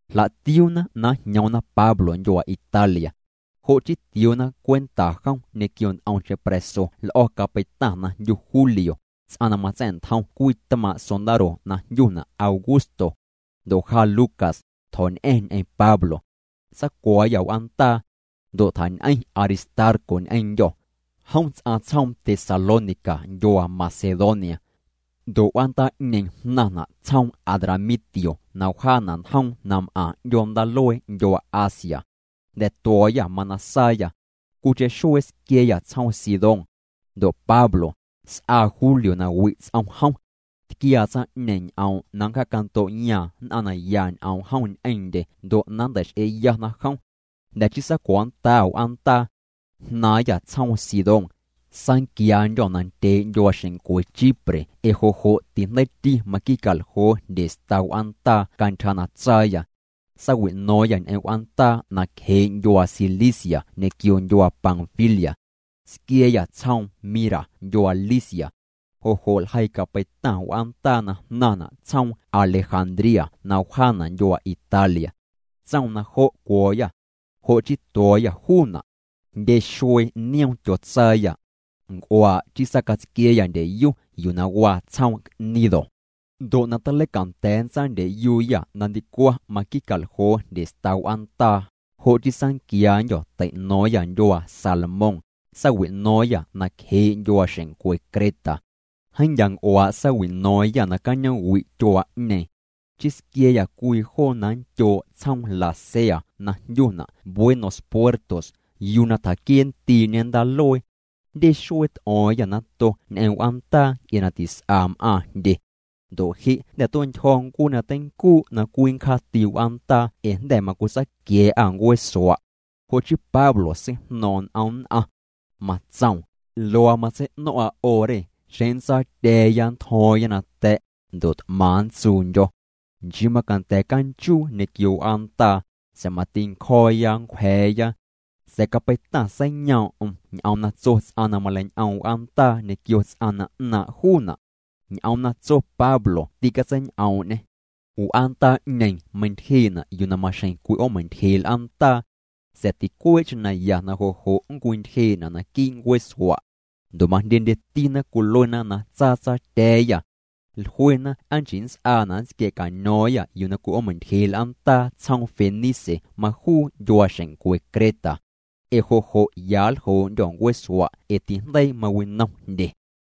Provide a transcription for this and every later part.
Jla'tiuuna na njñoomna Pablo ndyuaa Italia. Jo' chii tioona cwenta jom ñequio nt'omcheⁿ pra̱so l'o̱ capeitaⁿ na jndyu Julio, ts'aⁿ na matsa̱'ntjom cwii tmaaⁿ' sondaro na jndyuna' Augusto. Ndo' ja Lucas, tjo̱ñ'a̱ⁿ ñ'eⁿ Pablo. Saacuo̱o̱yâ w'aandaa. Ndo' tjañ'eⁿ Aristarco ñ'eⁿndyô̱. Jom ts'aⁿ tsjoom Tesalónica ndyuaa Macedonia. Ndo' w'aandaa'ñeeⁿ jnaⁿna' tsjoom Adramitio na wjaana' njoom na m'aⁿ 'ndyoo ndaaluee ndyuaa Asia. Jnda̱ tuo̱o̱yâ, mana saayâ. Cwiicheⁿ xuee squia̱a̱yâ tsjoom Sidón. Ndo' Pablo, s'aa Julio na wi' ts'om jom. Tquiaa tsaⁿ'ñeeⁿ ñ'oom' na nncjaacando'yaaⁿ nn'aⁿ na ya ñ'oom jom ñ'eⁿndye ndo' na nntei'x'eeyana jom. Jnda̱ chii saacuo̱o̱nndaa'â w'aandaa. Jnaaⁿyâ tsjoom Sidón. Saanquiandyô̱ nandyee' ndyuaaxeⁿncwe Chipre ee jo' jo' tijndeiiti maqui'caljoo jndye sta w'aandaa cantyja na tsaayâ. Saawi'no̱o̱ⁿyâ ñ'eⁿ w'aandaa nacjee' ndyuaa Cilicia ñequio ndyuaa Panfilia. Squia̱a̱yâ tsjoom Mira ndyuaa Licia. Jo' jo' ljeii capeitaⁿ w'aandaa na jnaⁿna' tsjoom Alejandría na wjaana' ndyuaa Italia. Tsoom na jo' cuo̱o̱yâ. Jo' chii tuo̱o̱yâ juuna'. Jndye xuee nioom tyotsaayâ. Nc'uaa' chii saacatsquia̱a̱yâ ndyeyu yuu na waa tsjoom Gnido. Ndo' na taleicanda̱a̱ nntsaandyeyuuyâ na ndicwaⁿ maqui'caljoo jndye sta w'aandaa, jo' chii saanquiandyô̱ tei'no̱o̱ⁿyâ ndyuaa Salmón, saawi'no̱o̱ⁿyâ nacjee' ndyuaaxeⁿncwe Creta. Jeeⁿ ndyaa' nc'uaa' saawi'no̱o̱ⁿyâ nacañoom'wi' tyuaa'ñeeⁿ. Chii squia̱a̱yâ cwii joo na nndyoo' tsjoom Lasea na jndyuna' Buenos Puertos yuu na tjaquiee'ndii'ñe ndaaluee. Jndye xuee t'o̱o̱ⁿyâ nato ñ'eⁿ w'aandaa nc'e na tis'a m'aaⁿ jndye. Ndo' je' jnda̱ tue'ntyjo̱ ncuee na teincuu' na cwii nncjaati w'aandaa ee jnda̱ macwitsaaquia̱a̱'â ncueesua'. Jo' chii Pablo seijno̱o̱ⁿ'o̱ⁿ n'om nn'aⁿ. Matsoom: —Luaa matsei'no̱ⁿ'a 'o re, xeⁿ nntsaatya̱a̱ya nntjo̱o̱ⁿya nata̱', ndo' t'maⁿ nntsuundyo̱. Nchii macanda̱ canchuu ñequio w'aandaa, sa̱a̱ mati ncjo̱o̱ya nncwja̱a̱ya. Sa̱a̱ capeitaⁿ seiyoom'm ñ'oom na tso ts'aⁿ na maleiñ'oom w'aandaa ñequio ts'aⁿ na 'naaⁿ' juuna'. Ñ'oom na tso Pablo tîcatseiñ'oom'ñê. W'aandaa'ñeeⁿ meintyjee'na' yuu na maxjeⁿ cwi'oomeintyjee' l'aandaa. Sa̱a̱ ticuee'cheⁿ na ya na jo' jo' nncwintyjee'na' naquii' ncueesua'. Ndo' majndyendyetina cwiluena na tsaatsaatya̱a̱yâ. Jluena aa nchii nnts'aana' na nntsquia̱caño̱o̱ⁿyâ yuu na cwi'oomeintyjee' l'aandaa tsjoom Fenice majuu ndyuaaxeⁿncwe Creta. Ee jo' jo' ya nljoo'ndyô̱ ncueesua' ee tijndeii mawinom jndye.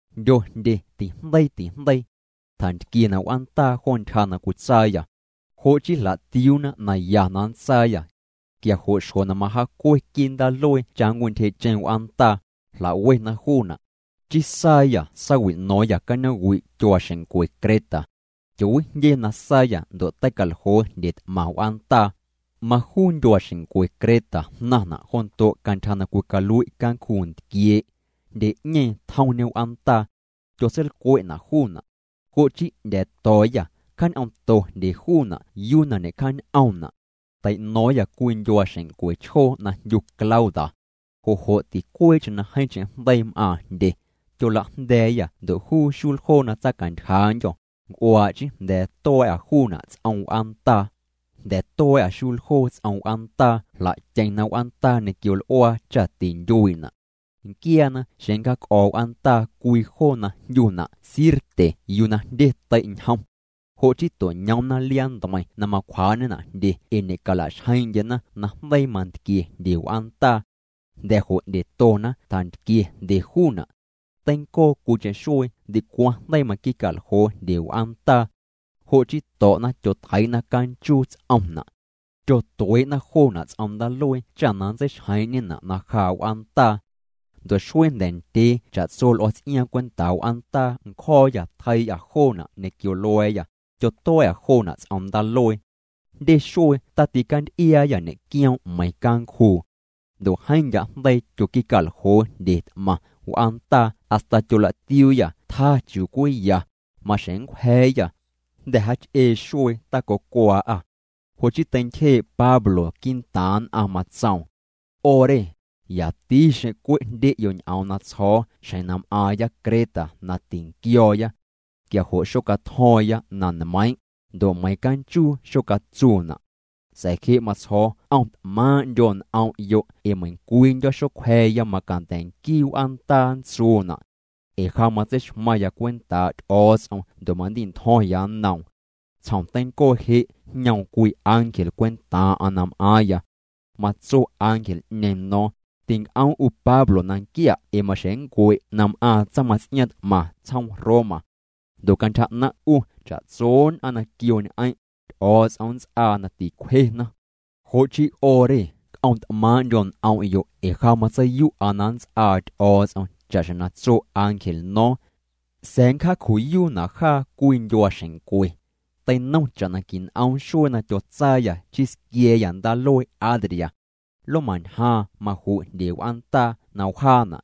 Jndyo jndye tijndeii tijndeii. Tjantquiena' w'aandaa jo ntyja na cwitsaayâ. Jo' chii jla'tiuuna na ya na nntsaayâ. Quia jo' xjo na majaacue quii' ndaaluee cha nncwintyjee'cheⁿ w'aandaa, jla'wena juuna'. Chii saayâ saawi'no̱o̱ⁿyâ cañoom'wi' tyuaaxeⁿncwe Creta. Tyoowijndye na saayâ ndo' tei'caljoo jndye t'maⁿ w'aandaa. Majuu ndyuaaxeⁿncwe Creta jnaⁿna' jondo' cantyja na cwicalui' cancjuu ntquiee'. Jndye'ñeeⁿ tjomñe w'aandaa. Tyotseilcwe'na' juuna'. Jo' chii 'ndya̱a̱to̱o̱yâ, cjaañ'oomto jndye juuna' yuu na ñe'cjaañ'oomna'. Tei'no̱o̱ⁿyâ cwii ndyuaaxeⁿncwe chjoo na jndyu Clauda. Jo' jo' ticuee'cheⁿ na jeeⁿcheⁿ jndeii m'aaⁿ jndye. Tyolajnda̱a̱yâ ndo' juu xuljoo na tsaacantyjaandyô, nc'uaa' chii jnda̱a̱ tua̱a̱'â juuna' ts'om w'aandaa. Jnda̱ tua̱a̱'â xuljoo ts'om w'aandaa jla'tyeⁿna w'aandaa ñequio l'uaa cha tintyuii'na'. Nquiaana xeⁿ nncjaac'o̱o̱' w'aandaa cwii joo na jndyuna' Sirte yuu na jndye tei' ñjom. Jo' chii to'ñoomna liaa ntmeiⁿ na macwjaa'ñena' jndye ee ñe'cala'xjeeⁿ'ndyena na jndeii mantquie jndye w'aandaa. Jnda̱ jo' 'ndyetona tjantquie jndye juuna'. Teincoo cwiicheⁿ xuee ndicwaⁿ jndeii maqui'caljoo jndye w'aandaa. Jo' chii to̱'na tyotjeii'na canchuu ts'omna'. Tyotuee'na joona' ts'om ndaaluee cha na nntseixjeeⁿ'ñena' na jaa' w'aandaa. Ndo' xuee jnda̱ ndyee cha'tso l'o̱o̱ ts'iaaⁿ cwentaa' w'aandaa ncjo̱o̱yâ tyotjeii'â joona' ñequio lua̱a̱yâ, tyotua̱a̱'â joona' ts'om ndaaluee. Jndye xuee taticanty'iaayâ ñe'quioom' meiⁿ cancjuu. Ndo' jeeⁿ ndya' jndeii tyoqui'caljoo jndye t'maⁿ w'aandaa hasta tyolatiuuyâ tjaa chiuu cwii ya, maxjeⁿ nncwja̱a̱yâ. Jnda̱ jaach'ee xuee tacocwaa'â. Jo' chii teintyjee' Pablo quii'ntaaⁿ nn'aⁿ. Matsoom: —'O re, yati xeⁿ cwe' jndye'yo' ñ'oom na tsjo̱o̱ xjeⁿ na m'aaⁿya Creta na tinquio̱o̱ya. Quia jo' xocatjo̱o̱ⁿya na nmeiiⁿ', ndo' meiiⁿ canchuu xocatsuuna'. Sa̱a̱ je' matsjo̱o̱ c'om't'maaⁿ'ndyo' n'om'yo' ee meiⁿcwiindyo̱ xocwja̱a̱ya macanda̱ nquii w'aandaa nntsuuna'. Ee ja matseixmaⁿya cwentaa' Ty'o̱o̱ts'om ndo' mandi'ntjo̱ⁿya nnoom. Tsjom teincoo je' jñoom cwii ángel cwentaaⁿ'aⁿ na m'aaⁿya. Matso ángel'ñeeⁿ no̱o̱ⁿ: “Tinc'oom' 'u Pablo na nquia' ee maxjeⁿ nncue' na m'aaⁿ tsaⁿmaⁿts'iaaⁿ t'maⁿ tsjoom Roma. Ndo' cantyja 'naⁿ' 'u cha'tso nn'aⁿ na quio ñ'eⁿ', Ty'o̱o̱ts'om nnts'aa na ticwjena.” Jo' chii 'o re c'om't'maaⁿ'ndyo' n'om'yo' ee ja matseiyu'a na nnts'aa Ty'o̱o̱ts'om cha'xjeⁿ na tso ángel no̱o̱ⁿ. Sa̱a̱ nncjaaju'yuuna' jaa cwii ndyuaaxeⁿncwe. Teinom cha'na quin'oom xuee na tyotsaayâ chii squia̱a̱yâ ndaaluee Adria. Lomañjaaⁿ maju' jndye w'aandaa na wjaana'.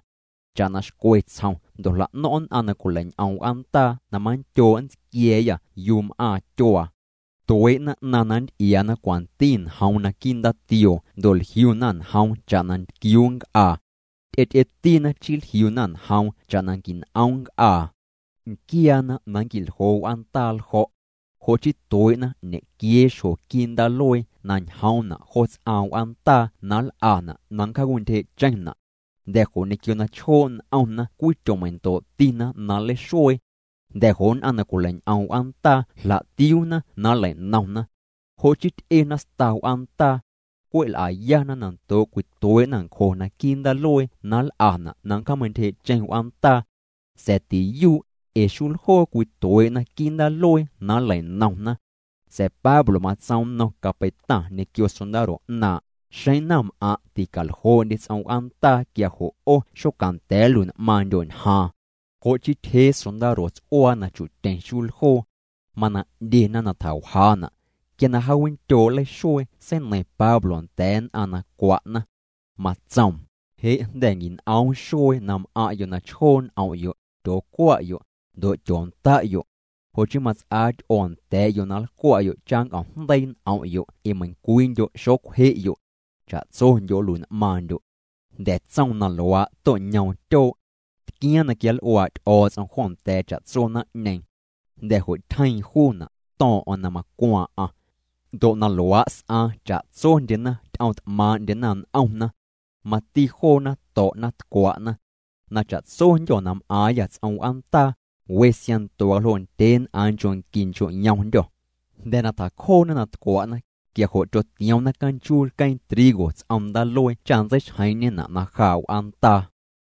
Cha'na xcwe tsjom ndo' jla'no̱ⁿ' nn'aⁿ na cwileiñ'om w'aandaa na manndyoo' nntsquia̱a̱yâ yuu m'aaⁿ tyuaa. Tuee'na 'naⁿ na nnty'iaana cwanti njoom naquii' ndaatioo ndo' jliuna njoom cha'na ntquiuu nc'aa. Ty'ety'etina chii jliuna njoom cha'na quin'oom nc'aa. Nquiaana na nnqui'ljoo w'aandaa ljo̱'. Jo' chii tuee'na ñequiee xjo quii' ndaaluee na ñjoomna' jo ts'aaⁿ w'aandaa na nl'ana' na nncjaawintyjee'cheⁿna'. Jnda̱ jo' ñequio na chjoo' n'omna cwii tyomeindo'tina na nleixuee. Jnda̱ jo' nn'aⁿ na cwileiñ'om w'aandaa jla'tiuuna na nlei'nomna. Jo' chii ty'ena sta w'aandaa. Cwe' l'ayana na ndoo' cwituee'na ncjo naquii' ndaaluee na nl'ana' na nncjaameintyje'cheⁿ w'aandaa. Sa̱a̱ tiyuu', ee xuljoo cwituee'na quii' ndaaluee na nlei'nomna. Sa̱a̱ Pablo matsoom nnom capeitaⁿ ñequio sondaro 'naaⁿ': —Xeⁿ naⁿm'aⁿ' ticaljoo'ndye ts'om w'aandaa quia jo' 'o xocanda̱a̱ nlui'n'maaⁿndyo' ñjaaⁿ. Jo' chii tyjee sondaro ts'uaa na chu'tyeⁿ xuljoo. Mana 'ndyena na tjawjaana'. Quia na jaawindyoo' nleixuee seineiⁿ Pablo nda̱a̱ nn'aⁿ na cwa'na. Matsoom: —Je' jnda̱ quin'oom xuee na m'aⁿ'yo' na chjoo' n'om'yo', tyoocwa'yo', ndo' tyoonda'yo'. Jo' chii mats'aa ty'oo nda̱a̱'yo' na nlcwa'yo' cha nnc'omjndeii' n'om'yo' ee meiⁿcwiindyo' xocwje'yo'. Cha'tsondyo' nlui'n'maaⁿndyo'. Jnda̱ tsoom na luaa' to'ñoom tyoo'. Tquiaaⁿ na quianl'uaa' Ty'o̱o̱ts'om jo nda̱a̱ cha'tso naⁿ'ñeeⁿ. Jnda̱ jo' tyjeeⁿ juuna', to̱o̱ⁿ'o̱ⁿ na macwaaⁿ'aⁿ. Ndo' na luaa' s'aaⁿ cha'tsondyena ty'omt'maaⁿ'ndyena n'omna. Mati joona to̱'na tcwa'na. Na cha'tsondyô̱ na m'aaⁿyâ ts'om w'aandaa, we siaⁿnto waljoo' ndyeen'aaⁿ nchoo' nqui nchoo' yomndyô̱. Jnda̱ na tjacjoona na tcwa'na, quia jo' tyotioomna canchuu lqueeⁿ trigo ts'om ndaaluee cha nntseixjeeⁿ'ñena' na jaa' w'aandaa.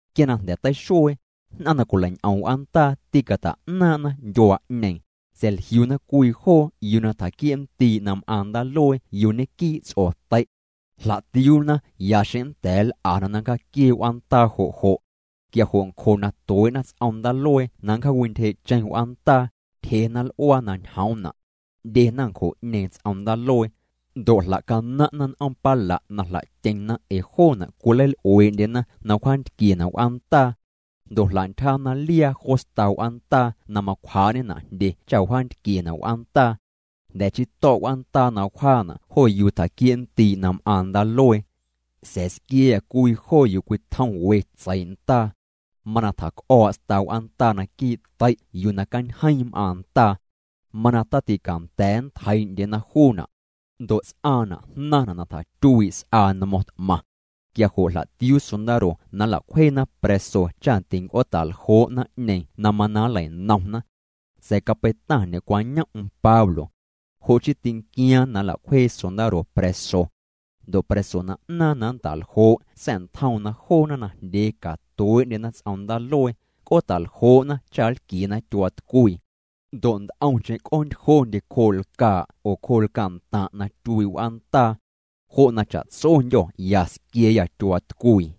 Quia na jnda̱ teixuee, nn'aⁿ na cwilei'ñ'om w'aandaa tîcata'naaⁿ'na ndyuaa'ñeeⁿ. Sa̱a̱ jliuna cwii joo yuu na tjaquiee'ndii' na m'aaⁿ ndaaluee yuu ñequii' ts'otei'. Jla'tiuuna ya xeⁿ nnda̱a̱ nl'ana na nncjaaquiee' w'aandaa jo' jo'. Quia jo' ncjo na tuee'na ts'om ndaaluee na nncjaawintyjee'cheⁿ w'aandaa, tyjena l'uaa na ñjoomna'. 'Ndyena ncjo'ñeeⁿ ts'om ndaaluee. Ndo' jla'canaⁿ'na n'oom pala' na jla'tyeⁿna ee joona' cwileil'uee'ndyena na wjaantquiena' w'aandaa. Ndo' jla'ntyjana liaa jo sta w'aandaa na macwjaa'ñena' jndye cha wjaantquiena' w'aandaa. Jnda̱ chii to̱' w'aandaa na wjaana' jo yuu tjaquiee'ndii' na m'aaⁿ ndaaluee. Sa̱a̱ squia̱a̱yâ cwii joo yuu cwitjom we tseii' ndaa. Mana tjac'o̱o̱' sta w'aandaa naquii' tei' yuu na cañjeiiⁿ m'aaⁿ ndaa. Mana taticanda̱a̱ nntjeii'ndyena juuna'. Ndo' ts'aaⁿna' jnaⁿna' na tjatyuii' s'aa nmo̱ⁿ t'maⁿ. Quia jo' jla'tiuu sondaro na nla'cwjeena pra̱so cha tinc'oota'ljoo' naⁿ'ñeeⁿ na mana nlei'nomna. Sa̱a̱ capeitaⁿ ñe'cwañom'm Pablo. Jo' chii tinquiaaⁿ na nla'cwjee sondaro pra̱so. Ndo' pra̱so na 'naaⁿ na nnta'ljoo' sa̱'ntjoom na joona najndyee catuee'ndyena ts'om ndaaluee, c'oota'ljoo'na cha nlquiena tyuaatcwii. Ndo' nt'omcheⁿ c'oontyjondye cjoo' lcaa' oo cjoo' lcaa'ntaⁿ' na tyuii' w'aandaa. Jo' na cha'tsondyô̱ ya squia̱a̱yâ tyuaatcwii.